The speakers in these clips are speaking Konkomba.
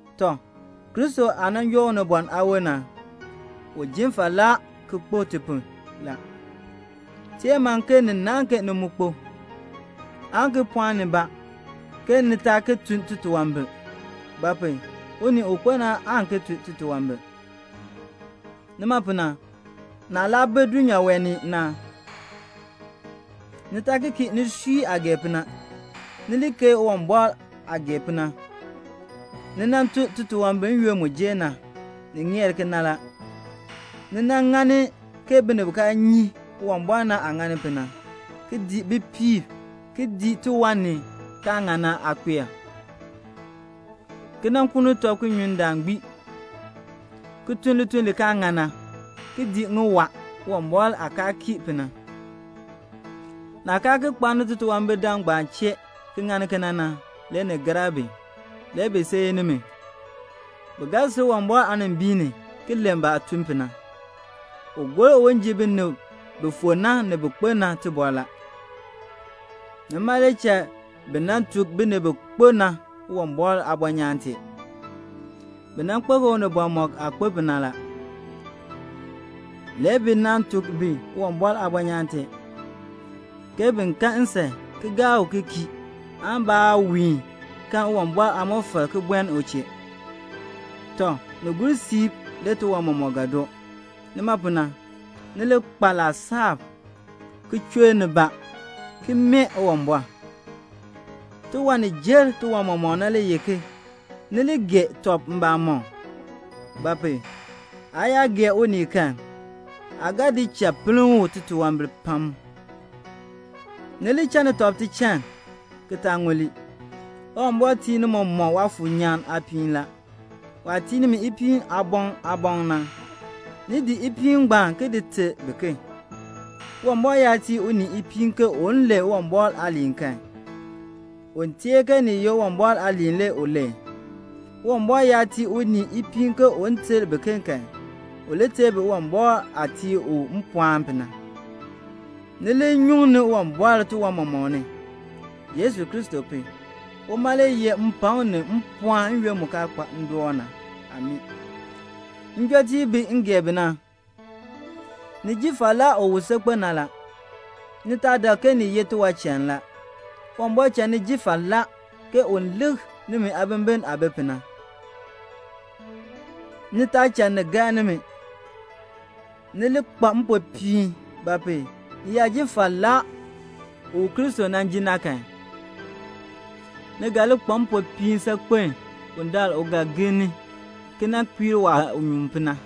Tɔ, Kristo aah nan joo unibɔn aawon na, u jin falaa ki kpo [ti pu la]. Teer man ke ni naahn ke ni mu kpo, aan ki pɔɔn nibaa ki taa ki tun titunwambir; ba pu? unii u kpo na aan ki tun titunwambir. Nima pu na, naah laa bi dulnyaa wee ni na, ni taa ki kii nisui aah gee pu na, ni li keei Uwumbɔr aah gee pu na. Ni nan tun titunwambir n-yoonn mu jer na; ni ŋeer kena la. Ni nan ŋani ke binib bi kaa nyi Uwumbɔr na aah ŋani pu na, ki dii bipiib, ki dii tiwan ni kaa ŋan na aakpeek, ki nan kuuni tɔb ki nyun ndaan gbii, ki tun lituln li kaa ŋan na, ki dii ŋiwaa, Uwumbɔr aah kaa kii pu na. Naah kaa ki kpaani titunwambir-dam ngbaan chee ki ŋani kena na, le ni gar bi. Le bi seei nimi. Bi ga sil Uwumbɔr aanimbiin ni ki len baah tun pu na. U gor un ji binib bi fu na ni bin kpo na tibɔr la. Nima le cha bi nan tuk binib bi kpo na Uwumbɔr aabɔnyaan tee. Bi nan kpo ke unibɔn mɔk aah kpo pu na. Le bi nan tuk bi Uwumbɔr aabɔnyaan tee, ke bin kan nsan ki gaa u ki kii aan baawiin kan Uwumbɔr aamɔfal ki buen u chee. Tɔ, ni gur siib tiwan mɔmɔk ga doo. Nima pu na, ni li kpa laasab, ki chur nibaa, ki mee Uwumbɔr. Tiwan ni jer tiwan mɔmɔk na le ye ni li gee tɔb mbamɔm; ba pu? aa yaa gee unii kan aa ga di cha pinn u titunwambir pam. Ni li channi tɔb tichann ki taa ŋuli. Uwumbɔr tii ni mɔmɔk Waafuur nyaan aapiin la. Waah tii nimi ipiin aaboŋ aaboŋ na, ni di ipiin ngbaan ki di ter biken. Uwumbɔr yaa tii unii ipiin ke un len Uwumbɔr aaliin kan, un teer ke ni ye Uwumbɔr aaliin le u len. Uwumbɔr yaa tii unii ipiin ke un ter biken kan, u li ter bi Uwumbɔr aah tii u mpɔɔn pu na. Ni li nyuŋni Uwumbɔr tiwan mɔmɔk ni, Yesu Kristo pu. Uma le yeh mpakm ni mpɔɔn n-yoonn mu kaa kpa ndoon na. Amii. Njɔtiib bi m gee bi na, ni ji falaa u wu saakpen na la. Ni taa dak ke ni ye tiwanchann la. Uwumbɔr cha ni ji falaa un lik nimi aabimbin aah bi pu na. Ni taa cha ni gar nimi. Ni li kpa mpopiin; ba pu? ni yaa ji falaa u Kristo nan jin na kan, ni ga li kpa mpopiin saakpen bundaln u ga gir ni ki kpiir waah nyuun pu na.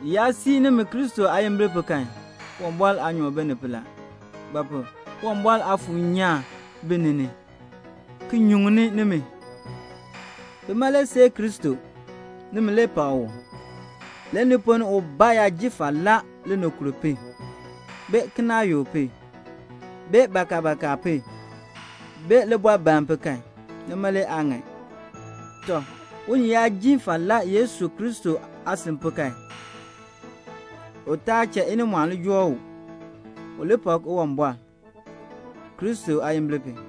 Bi yaa sii nimi Kristo aayimbil pu kan, Uwumbɔr aanyoor bi ni pu la; ba pu? Uwumbɔr Aafuur nyaan bi ni ni, ki nyuŋni nimi. [Bima le seei Kristo. Nimi le pak u.] Le ni ponn ni ubaa yaa ji falaa linikur pu, bee kinaayuk pu, bee bakabaka pu, bee libɔbaln pu kan, nima le aa ŋan. Tɔ, unii yaa ji falaa Yesu Kristo aasan pu kan, u taa cha inimɔɔn li joo u. U li pak Uwumbɔr, Kristo aayimbil pu.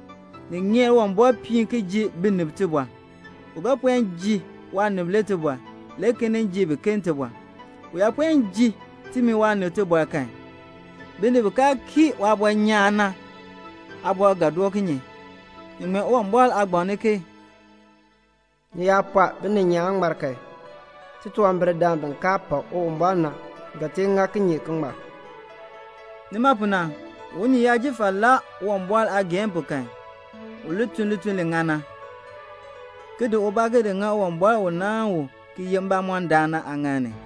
Ni ŋeer Uwumbɔr piin ki ji binib tibɔr. U ga puen ji waanib le tibɔr, le ki nin ji biken tibɔr. U yaa puen ji timi waanib tibɔr kan, binib bi kaa kii waabɔnyaan na aabɔr ga doo kinye? Ni ŋmee Uwumbɔr aagbaŋ ni ke "Ni yaa pɔɔ bininyaan ŋmar kan, titunwambirdam bi kaa pak Uwumbɔr na ga tee ŋa kinye ki ŋmar?" Nima pu na, unii yaa ji falaa Uwumbɔr aageehn pu kan, u li tun lituln li ŋan na, ki di ubaa ki di ŋa Uwumbɔr u nan naan u ki ye mbamɔndaan na aaŋaal ni.